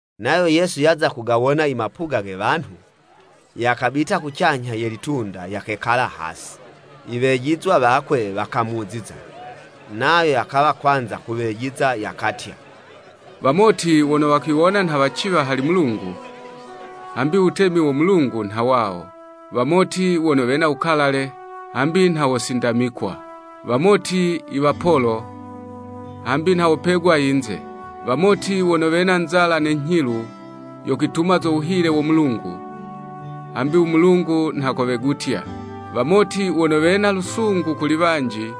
Nayo Yesu yaza kugawona imapuga ge wanhu, yakabita kucanyha ye litunda yakekala hasi. Iwejizwa wakwe wakamuziza, nayo yakawa kwanza kuwejiza yakatya, “Wamoti wono wakwiwona nha waciwa hali Mulungu, hambi u wutemi wo Mulungu nha wawo. Wamoti wono wena wukalale, hambi nha wosindamikwa. Wamoti iwapolo, hambi nha wopegwa yinze. Wamoti wono wena nzala ne nyhilu, yo kwituma zo wuhile wo Mulungu, hambi u Mulungu nha kowegutya. Wamoti wono wena lusungu kuli wanji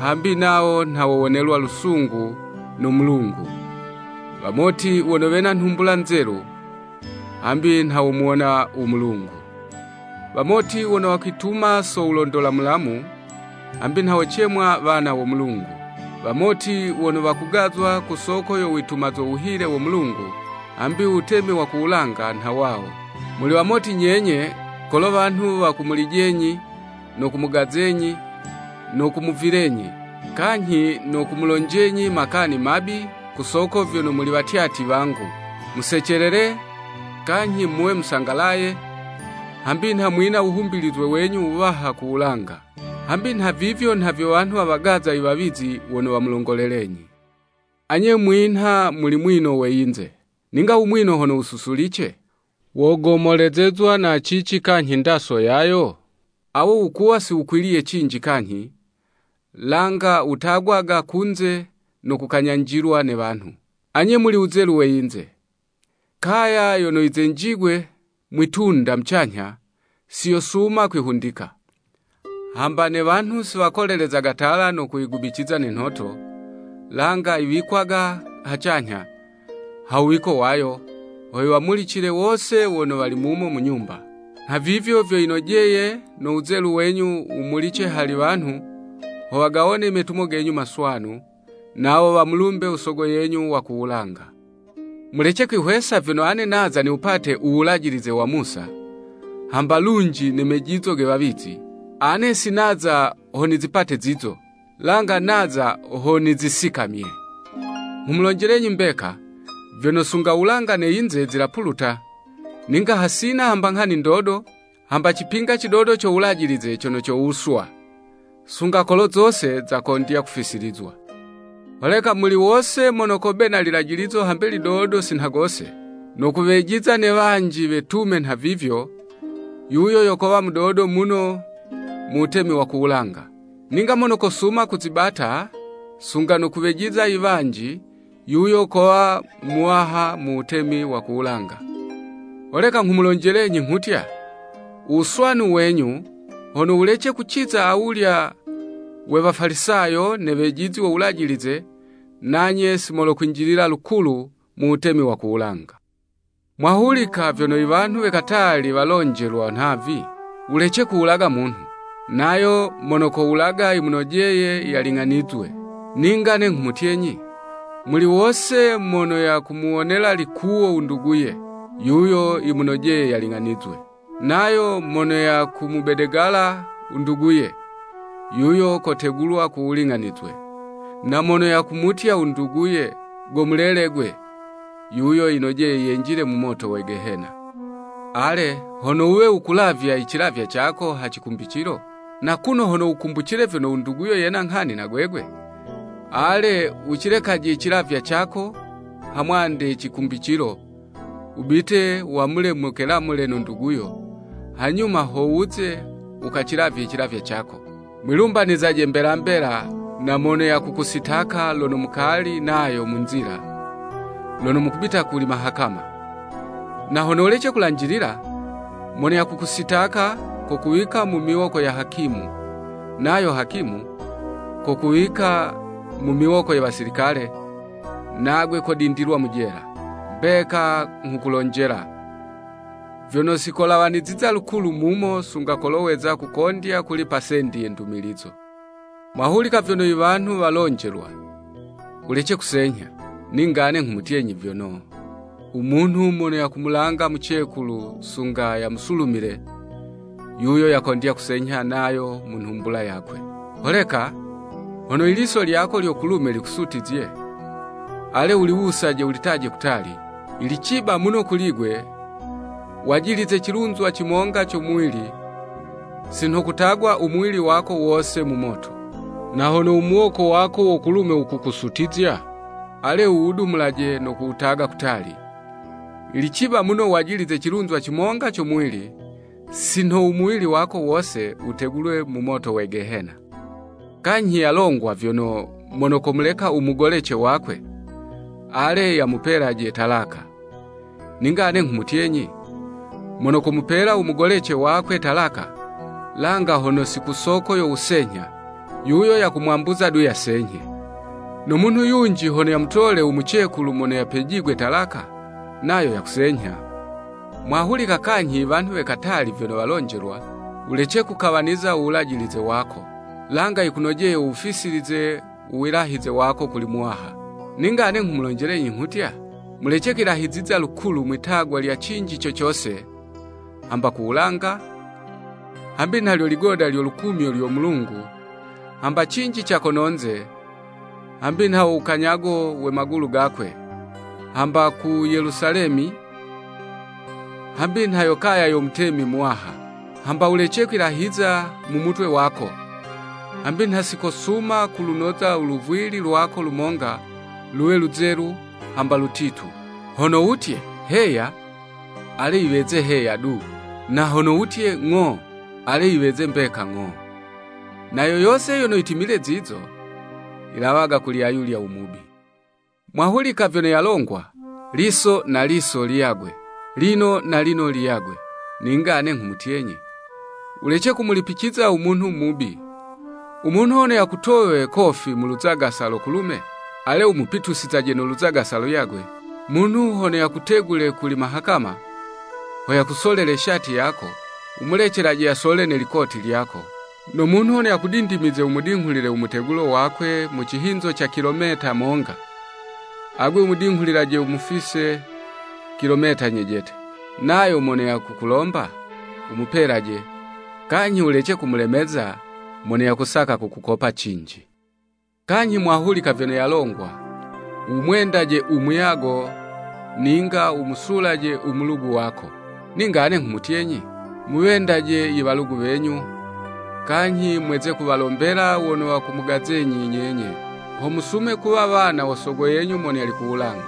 hambi nawo nha wowonelwa lusungu no Mulungu. Wamoti wono wena nhumbula nzelu, hambi nha womuwona u Mulungu. Wamoti wono wakwituma so wulondola mulamu, hambi nha wocemwa wana wo Mulungu. Wamoti wono wakugazwa ku soko yo wituma zo wuhile wo Mulungu, hambi u Wutemi wa ku wulanga nha wawo! “Muli wamoti nyenye, kolo wanhu wakumulijenyi, no kumugazenyi, no kumuvilenyi, kanyhi no kumulonjenyi makani mabi ku soko vyono muli watyatyi wangu. Musecelele, kanyhi muwe musangalaye, hambi nha mwina wuhumbilizwe wenyu wuwaha ku wulanga. Hambi nha vivyo nha vyo wanhu wawagaza i wawizi wono wamulongolelenyi. “Anye mwinha muli mwino mu yinze! Ninga u mwino hono wususulice, wogomolezezwa na cici kanyhi ndaso yayo? Awo wukuwa si wukwiliye cinji kanyhi, langa wutagwaga kunze no kukanyanjilwa ne wanhu. “Anye muli wuzelu we yinze! Kaya yono yizenjigwe mwi'tunda mucanyha, siyosuma kwihundika. Hamba ne wanhu si wakolelezaga tala no kuyigubiciza ne nhoto, langa yiwikwaga hacanyha, ha wuwiko wayo, ho yiwamulicile wose wono wali mumo mu nyumba. Nha vivyo vyo yinojeye no wuzelu wenyu wumulice hali wanhu, ho wagawone imetumo genyu maswanu, nawo wamulumbe u sogo yenyu wa ku wulanga. “Mulece kwihwesa vyono ane naza ho niwupate u Wulajilize wa Musa, hamba lunji ne mejizo ge wawizi. Ane si naza ho nizipate zizo, langa naza ho nizisikamye. Nghumulonjelenyi mbeka, vyono sunga u wulanga ne yinze zilapuluta, ninga hasina hamba nghani ndodo, hamba cipinga cidodo co Wulajilize cono cowuswa, sunga kolo zose zakondya kufisilizwa. Holeka muli wose mono kobena ililajilizo hambe lidodo sinha gose, no kuwejiza ne wanji wetume nha vivyo, yuyo yo kowa mudodo muno mu wutemi wa ku wulanga. Ninga mono kosuma kuzibata, sunga no kuwejiza iwanji, yuyo kowa muwaha mu wutemi wa ku wulanga. Holeka nghumulonjelenyi nghutya, u wuswanu wenyu, hono wulece kuciza awulya we Wafalisayo ne wejizi wo Wulajilize, nanye si mokwinjilila lukulu mu wutemi wa ku wulanga.” “Mwahulika vyono iwanhu we katali walonjelwa nhavi, ‘Wulece kuwulaga munhu! Nayo mono kowulaga, yimunojeye yaling'anizwe.’ Ninga ane nghumutyenyi, muli wose mono yakumuwonela likuwo u nduguye, yuyo yimunojeye yaling'anizwe. Nayo mono yakumubedegala u nduguye, yuyo kotegulwa ku wuling'anizwe. Na mono yakumutya u nduguye ‘Go mulele gwe,’ yuyo yanojeye yenjile mu moto we Gehena. Ale, hono wuwe wukulavya icilavywa cako ha cikumbicilo, na kuno hono wukumbucile vyono u nduguyo yena nghani na gwegwe, ale, wucilekaje icilavywa cako, ha mwande ye cikumbicilo, wubite wamule mukelamule no nduguyo, hanyuma ho wuze, wukacilavye icilavywa cako. “Mwilumbanizaje mbela mbela na mono yakukusitaka lono mukali nayo mu nzila, lono mukubita kuli mahakama. Na hono wulece kulanjilila, mono yakukusitaka, kokuwika mu miwoko ya hakimu, nayo hakimu, kokuwika mu miwoko ye wasilikale, nagwe kudindilwa mu jela. Mbeka nghukulonjela, vyono sikolawaniziza lukulu mumo sunga kolo weza kukondya kulipa sendi ye ndumilizo.” “Mwahulika vyono iwanhu walonjelwa, ‘Wulece kusenyha!’ Ninga ane nghumulonjelenyi vyono, umunhu mono komulanga mucekulu sunga yamusulumile, yuyo yakondya kusenyha nayo mu nhumbula yakwe. Holeka, hono iliso lyako lyo kulume likusutizye, ale, wuliwusaje wulitaje kutali. Yili ciba muno kuli'gwe, wajilize cilunzwa cimonga co muwili, si nho kutagwa u muwili wako wose mu moto. Na hono u muwoko wako wo kulume wukukusutizya, ale, wuwudumulaje no kuwutaga kutali. Yili ciba muno wajilize cilunzwa cimonga co muwili, si nho u muwili wako wose wutegulwe mu moto we Gehena.” “Kanyhi yalongwa vyono, ‘Mono komuleka u mugolece wakwe, ale yamupelaje talaka.’ Ninga ane nghumutyenyi, mono komupela u mugolece wakwe talaka, langa hono si ku soko yo wusenyha, yuyo yakumwambuza du yasenyhe, no munhu yunji hono yamutole u mucekulu mono yapejigwe talaka, nayo yakusenyha.” “Mwahulika kanyhi iwanhu we katali vyono walonjelwa, ‘Wulece kukawaniza uwilahize wako, langa yikunojeye wuwufisilize u wilahize wako kuli Muwaha.’ Ninga ane nghumulonjelenyi nghutya, mulece kwilahiziza lukulu mwi'tagwa lya cinji co cose, hamba ku wulanga, hambi nha lyo ligoda lyo lukumyo lyo Mulungu, hamba cinji ca kono'nze, hambi nha wo wukanyago we magulu gakwe, hamba ku Yelusalemi, hambi nha yo kaya yo Mutemi muwaha. Hamba wulece kwilahiza mu mutwe wako, hambi nha sikosuma kulunoza u luvwili lwako lumonga, luwe luzelu hamba lutitu. Hono wutye, ‘Heya’ ale yiweze ‘Heya du!’ Na hono wutye, ‘Ng'o’ ale yiweze mbeka ‘Ng'o.’ Na yo yose yono yitimile zizo, yilawaga kuli ayulya u Mubi.” “Mwahulika vyono yalongwa, ‘Liso na liso liyagwe, lino na lino liyagwe.’ Ninga ane nghumutyenyi, wulece kumulipiciza u munhu mubi. U munhu hono yakutowe kofi mu luzagasa lo kulume, ale wumupitusizaje no luzagasa luyagwe. Munhu hono yakutegule kuli mahakama, ho yakusolele shati yako, wumulecelaje yasole ne likoti lyako. No munhu hono yakudindimize wumudinghulile u mutegulo wakwe mu cihinzo ca kilometa monga, agwe wumudinghulilaje wumufise kilometa nyejete. Nayo mono yakukulomba, wumupelaje, kanyhi wulece kumulemeza mono yakusaka kukukopa cinji.” “Kanyhi mwahulika vyono yalongwa, ‘Wumwendaje u muyago ninga wumusulaje u mulugu wako.’ Ninga ane nghumutyenyi, ‘Muwendaje iwalugu wenyu, kanyhi mweze kuwalombela wono wakumugazenyi nyenye, ho musume kuwa wana wo Sogo yenyu mono yali ku wulanga.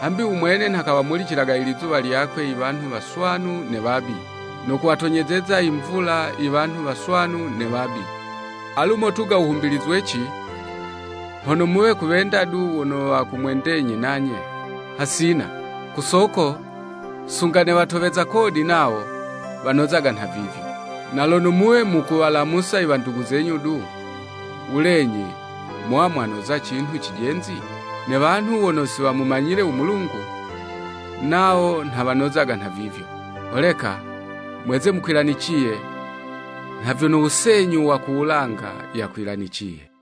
Hambi u Mwene nha kawamulicilaga ilizuwa lyakwe iwanhu waswanu ne wabi, no kuwatonyezeza imvula iwanhu waswanu ne wabi.’ Alu motuga wuhumbilizweci hono muwe kuwenda du wono wakumwendenyi nanye? Hasina! Ku soko sunga ne watoweza kodi nawo wanozaga nhavivyo. Na lono muwe mukuwalamusa iwandugu zenyu du, wulenyi mowa mwanoza cinhu cijenzi? Ne wanhu wono si wamumanyile u Mulungu, nawo nha wanozaga nhavivyo. Holeka mweze mukwilaniciye, nha vyono u Senyu wa ku wulanga yakwilaniciye.”